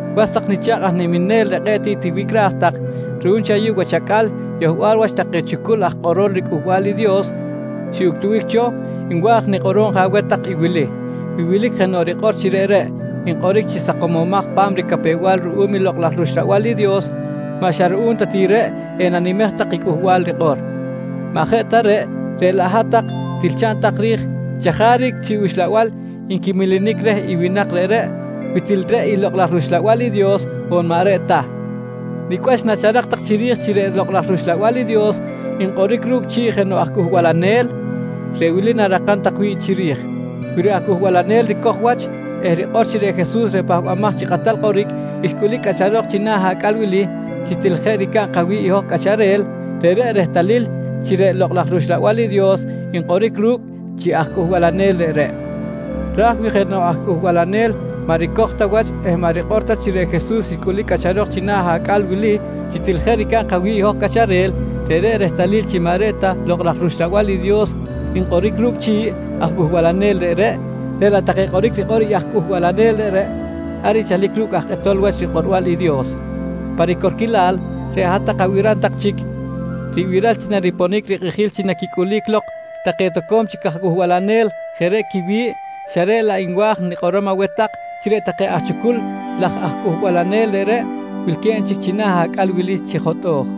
Was tak nicha̱kꞌ aj niminel reꞌ kꞌe̱ꞌ tiꞌ tiwicꞌraj tak, ruꞌum chi ayuꞌ wach acꞌal yohbal wach take chucul aj kꞌorol riCꞌuhbal i Dios xiꞌuctubic cho nwa̱j nikꞌorom je aweh tak i wili: Wi wilic jenoꞌ rikꞌor chi reꞌreꞌ nkꞌoric chi sakomomaj pa̱m ricapew-bal ruꞌum i Lokꞌ laj rUxlabal i Dios, maꞌ xa ruꞌum ta ti reꞌ enanimej tak i cꞌuhbal rikꞌor. Maꞌ jeꞌ ta reꞌ, reꞌ laꞌ hat-tak til chaꞌn tak ri̱j chajaric chi uxlabal nquimelenic reh i winak reꞌreꞌ, wi til reꞌ i Lokꞌ laj rUxlabal i Dios on maꞌ reꞌ ta. Nicꞌ wach nacharak tak chiri̱j chi reꞌ Lokꞌ laj rUxlabal i Dios nkꞌoric ru̱cꞌ chi̱ꞌ jenoꞌ aj cꞌuhbalanel? Reꞌ wili na̱rakam tak wi̱ꞌ chiri̱j: Wi reꞌ aj cꞌuhbalanel ricoj wach eh rikꞌor chi reꞌ Jesus reꞌ Pahbamaj chi Kꞌatal Kꞌoric xcꞌulic cꞌacharok china̱ acꞌal wili chi til jeꞌ ricab kawi̱ꞌ i hoj cꞌacharel, reꞌreꞌ rehtalil chi reꞌ Lokꞌ laj rUxlabal i Dios nkꞌoric ru̱cꞌ chi̱ꞌ aj cꞌuhbalanel reꞌreꞌ. Raj wi jenoꞌ aj cꞌuhbalanel maꞌ ricoj ta wach eh maꞌ rikꞌor ta chi reꞌ Jesus xcꞌulic cꞌacharok china̱ acꞌal wili chi til jeꞌ ricab kawi̱ꞌ i hoj cꞌacharel, reꞌreꞌ rehtalil chi maꞌ reꞌ ta Lokꞌ laj rUxlabal i Dios nkꞌoric ru̱cꞌ chi̱ꞌ aj cꞌuhbalanel reꞌreꞌ, reꞌ laꞌ take kꞌoric rikꞌor i aj cꞌuhbalanel reꞌreꞌ ar nchalic ru̱cꞌ aj kꞌetol wach rikꞌorbal i Dios. Pa ricorquilal, reꞌ hat-tak abiram tak chic ribiral chi nariponic rikꞌijil chi naquicꞌulic lok take toco̱m chic aj cꞌuhbalanel jeꞌ reꞌ quiwi̱ꞌ, xa reꞌ laꞌ nwa̱j nikꞌorom aweh tak chi reꞌ take aj chucul laj aj cꞌuhbalanel reꞌreꞌ wilque̱b chic china̱ acꞌal wili chi jotꞌo̱j.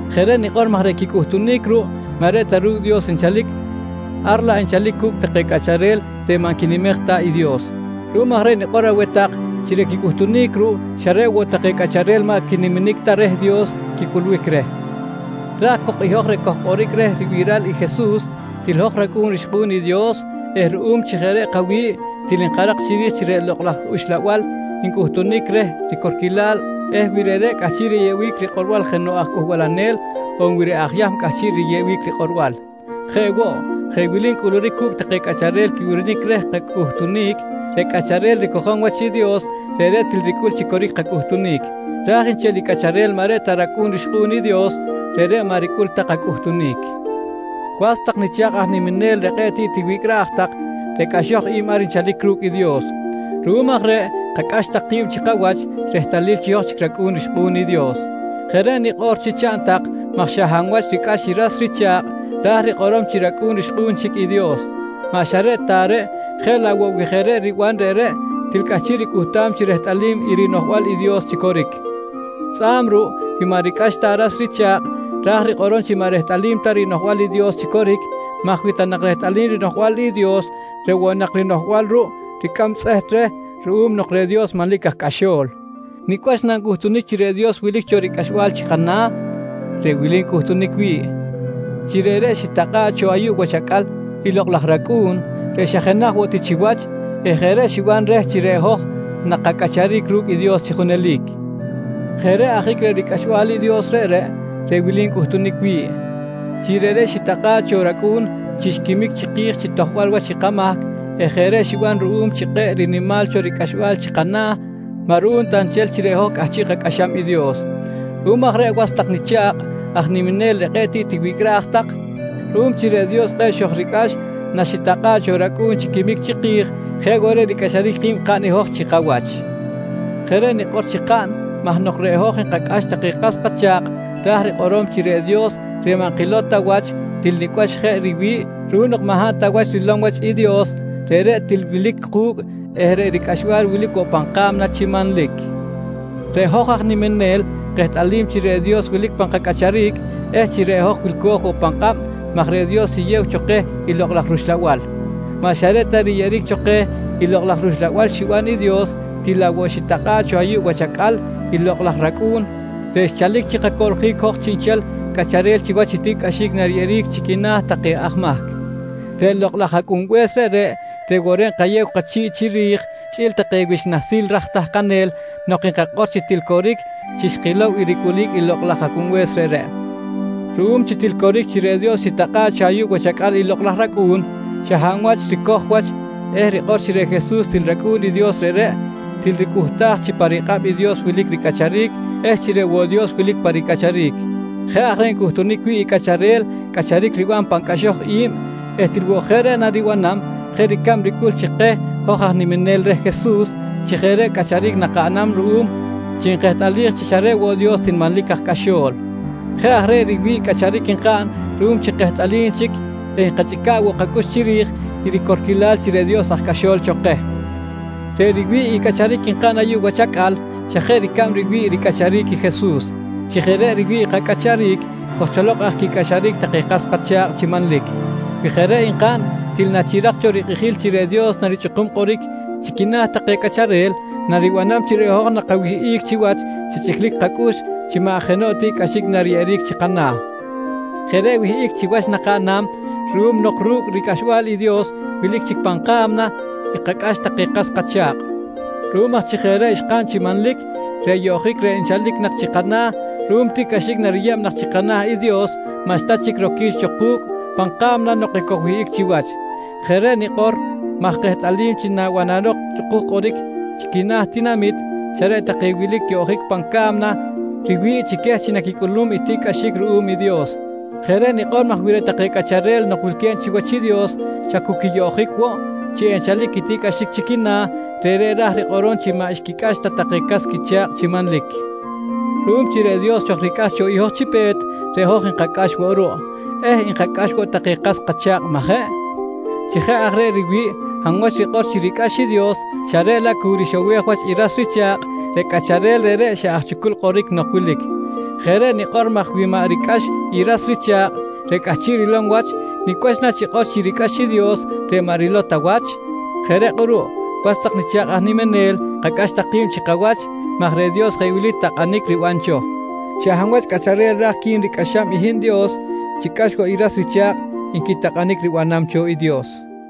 Jeꞌ reꞌ nikꞌor maj reꞌ quicꞌuhtunic ruꞌ maꞌ reꞌ ta ru̱cꞌ Dios nchalic ar laꞌ nchalic cu̱cꞌ take cꞌacharel reꞌ maꞌ nquinimej ta i Dios. Ruꞌum aj reꞌ nikꞌor aweh tak chi reꞌ quicꞌuhtunic ruꞌ xa reꞌ woꞌ take cꞌacharel maꞌ quiniminic ta reh i Dios quicꞌulbic reh. Raj cok i hoj reꞌ kojkꞌoric reh ribiral i Jesus, til hoj racꞌu̱n rixkꞌu̱n i Dios eh ruꞌum chi jeꞌ reꞌ kawi̱ꞌ, til nkarak chiri̱j chi reꞌ Lokꞌ laj Uxlabal ncꞌuhtunic reh i ricorquilal eh wi reꞌreꞌ cꞌahchiꞌ riyeꞌbic rikꞌorbal jenoꞌ aj cꞌuhbalanel on wi reꞌ aj Yahm cꞌahchiꞌ riyeꞌbic rikꞌorbal. Jeꞌ woꞌ, jeꞌ wili ncꞌuluric cu̱cꞌ take cꞌacharel quibirinic reh kacꞌuhtunic: Reꞌ cꞌacharel ricojom wach i Dios reꞌreꞌ til ricꞌul chi coric kacꞌuhtunic. Raj nchel i cꞌacharel maꞌ reꞌ ta racꞌu̱n rixkꞌu̱n i Dios, reꞌreꞌ maꞌ ricꞌul ta kacꞌuhtunic. Was tak nicha̱kꞌ aj niminel reꞌ kꞌe̱ꞌ tiꞌ tiwicꞌraj tak, reꞌ cꞌaxoj i̱b ar nchalic ru̱cꞌ i Dios. Ruꞌum aj reꞌ kacꞌax tak ki̱b chi kawach rehtalil chi hoj chic racꞌu̱n rixkꞌu̱n i Dios. Jeꞌ reꞌ nikꞌor chi chaꞌn tak maj xa hab wach ricꞌax i ras richa̱kꞌ ra̱j rikꞌorom chi racꞌu̱n rixkꞌu̱n chic i Dios. Maꞌ xa reꞌ ta reꞌ, jeꞌ laꞌ woꞌ wi jeꞌ reꞌ riban reꞌreꞌ til cꞌahchiꞌ ricꞌuhtam chi rehtꞌalim i rinoꞌjbal i Dios chi coric. Tzꞌa̱b ruꞌ wi maꞌ ricꞌax ta ras richa̱kꞌ, ra̱j rikꞌorom chi maꞌ rehtꞌalim ta rinoꞌjbal i Dios chi coric maj wi ta nak rehtꞌalim rinoꞌjbal i Dios reꞌ woꞌ nak rinoꞌjbal ruꞌ ricꞌam tzꞌeht reh ruꞌum nok reꞌ Dios manlic aj cꞌaxo̱l. Nicꞌ wach nancꞌuhtunic chi reꞌ Dios wilic cho ricꞌaxbal chi kana̱? Reꞌ wili ncꞌutunic wi̱ꞌ: Chi reꞌreꞌ xitakꞌa̱ꞌ cho ayuꞌ wach acꞌal i Lokꞌ laj rAcꞌu̱n reꞌ xa jenaj woꞌ ti chiwach eh jeꞌ reꞌ xiban reh chi reꞌ hoj nakacꞌacharic ru̱cꞌ i Dios chi junelic. Jeꞌ reꞌ ajic reꞌ ricꞌaxbal i Dios reꞌreꞌ, reꞌ wili ncꞌutunic wi̱ꞌ: Chi reꞌreꞌ xitakꞌa̱ꞌ cho rAcꞌu̱n chi xquimic chiki̱j chi tojbal wach i kamahc eh jeꞌ reꞌ xiban ruꞌum chi kꞌe̱ꞌ rinimal cho ricꞌaxbal chi kana̱, maꞌ ruꞌum ta nchel chi reꞌ hoj cꞌahchiꞌ kacꞌaxam i Dios. Ruꞌum aj reꞌ was tak nicha̱kꞌ aj niminel reꞌ kꞌe̱ꞌ tiꞌ tiwicꞌraj tak, ruꞌum chi reꞌ Dios kꞌe̱ꞌ xojricꞌax naxitakꞌa̱ꞌ cho rAcꞌu̱n chi quimic chiki̱j, jeꞌ woꞌ reꞌ ricꞌaxaric ki̱b kaꞌn i hoj chi kawach. Jeꞌ reꞌ nikꞌor chi kaꞌn maj nok reꞌ hoj nkacꞌax take kas kacha̱kꞌ ra̱j rikꞌorom chi reꞌ Dios reꞌ maꞌ nkilow ta wach til nicꞌ wach jeꞌ riwi̱ꞌ ruꞌum nok maꞌ hab ta wach rilom wach riwi̱ꞌ i Dios, reꞌreꞌ til wilic ku̱cꞌ eh reꞌ ricꞌaxbal wilic woꞌ pan ka̱mna chi manlic. Reꞌ hoj aj niminel kehtꞌalim chi reꞌ Dios wilic pan kacꞌacharic eh chi reꞌ hoj wilco̱j woꞌ pan kꞌab maj reꞌ Dios xiyew cho keh i Lokꞌ laj rUxlabal. Maꞌ xa reꞌ ta riyeꞌeric cho keh i Lokꞌ laj rUxlabal xiban i Dios, til laꞌ woꞌ xitakꞌa̱ꞌ cho ayuꞌ wach acꞌal i Lokꞌ laj rAcꞌu̱n reꞌ xchalic chi kacoꞌljic hoj chiꞌnchel cꞌacharel chiwach i tiꞌcꞌaxic nariyeꞌeric chi quina̱ take aj mahc. Reꞌ Lokꞌ laj Acꞌunbe̱s reꞌreꞌ, reꞌ woꞌ reꞌ nkayew kachi̱ꞌ chiri̱j chꞌi̱l take wich nahsil raj tahkanel nok nkakꞌor chi til coric chi xkilow i ricꞌulic i Lokꞌ laj Acꞌunbe̱s reꞌreꞌ. Ruꞌum chi til coric chi reꞌ Dios xitakꞌa̱ꞌ cho ayuꞌ wach acꞌal i Lokꞌ laj rAcꞌu̱n, xa hab aj wach ricoj wach eh rikꞌor chi reꞌ Jesus til rAcꞌu̱n i Dios reꞌreꞌ, til ricꞌuhtaj chi pa rikꞌab i Dios wilic ricꞌacharic eh chi reꞌ woꞌ Dios wilic pa ricꞌacharic. Jeꞌ aj reꞌ ncꞌuhtunic wi̱ꞌ i cꞌacharel cꞌacharic riban pan cꞌaxoj i̱b eh til woꞌ jeꞌ reꞌ naribanam jeꞌ ricab ricꞌul chi keh hoj aj niminel reh Jesus chi jeꞌ reꞌ cꞌacharic nakaꞌnam ruꞌum chi nkehtꞌalij chi xa reꞌ woꞌ Dios til manlic aj cꞌaxo̱l. Jeꞌ aj reꞌ riwi̱ꞌ cꞌacharic nkaꞌn ruꞌum chi kehtꞌalim chic eh nkachꞌica̱ꞌ woꞌ kacꞌux chiri̱j i ricorquilal chi reꞌ Dios aj cꞌaxol cho keh. Reꞌ riwi̱ꞌ i cꞌacharic nkaꞌn ayuꞌ wach acꞌal xa jeꞌ ricab riwi̱ꞌ i ricꞌacharic Jesus. Chi jeꞌ reꞌ riwi̱ꞌ i kacꞌacharic, kojcholok aj quicꞌaxaric take kas kacha̱kꞌ chi manlic. Wi jeꞌ reꞌ nkaꞌn, til nachirak cho rikꞌijil chi reꞌ Dios narichꞌukum kꞌoric chi quina̱ take cꞌacharel naribanam chi reꞌ hoj nakawihꞌic chiwach chi chꞌiclic kacꞌux chi maꞌ jenoꞌ tiꞌcꞌaxic nariyeꞌeric chi kana̱. Jeꞌ reꞌ wihꞌic chiwach nakaꞌnam ruꞌum nok ru̱cꞌ i ricꞌaxbal i Dios wilic chic pan ka̱mna xkacꞌax take kas kacha̱kꞌ. Ruꞌum aj chi jeꞌ reꞌ xkaꞌn chi manlic, reꞌ yoꞌjic reꞌ nchalic nak chi kana̱ ruꞌum tiꞌcꞌaxic nariyeb nak chi kana̱ i Dios maꞌxta chic roquic cho ku̱cꞌ pan ka̱mna nok ekojwihꞌic chiwach. Jeꞌ reꞌ nikꞌor maj kehtꞌalim chi nabanarok chꞌukuj kꞌoric chi quina̱ tinamit, xa reꞌ take wilic yoꞌjic pan ca̱mna riwi̱ꞌ chi queh chi naquicꞌulum i tiꞌcꞌaxic ruꞌum i Dios. Jeꞌ reꞌ nikꞌor maj wi reꞌ take cꞌacharel nok wilque̱b chiwach i Dios xa cu quiyoꞌjic woꞌ chi enchalic i tiꞌcꞌaxic chi quina̱, reꞌreꞌ ra̱j rikꞌorom chi maꞌ xquicꞌax ta take cas quicha̱kꞌ chi manlic. Ruꞌum chi reꞌ Dios xojricꞌax cho i hoj chi pe̱t, reꞌ hoj nkacꞌax woꞌ ruꞌ eh nkacꞌax woꞌ take kas kacha̱kꞌ, majeꞌ? Chi jeꞌ aj reꞌ wi hab wach rikꞌor chi ricꞌax i Dios xa reꞌ laꞌ cu rixowej wach i ras richa̱kꞌ, reꞌ cꞌacharel reꞌreꞌ xa aj chucul kꞌoric nok wilic. Jeꞌ reꞌ nikꞌor maj wi maꞌ ricꞌax ta i ras richa̱kꞌ reꞌ cꞌahchiꞌ rilom wach nicꞌ wach nachikꞌor chi ricꞌax i Dios reꞌ maꞌ rilow ta wach? Jeꞌ reꞌ kꞌuruꞌ was tak nicha̱kꞌ aj niminel, kacꞌax tak ki̱b chi kawach maj reꞌ Dios jeꞌ wili takꞌanic riban cho: “Xa hab wach cꞌacharel raj qui̱n ricꞌaxam i hin Dios, chicꞌax woꞌ i ras richa̱kꞌ, nqui takꞌanic ribanam cho i Dios.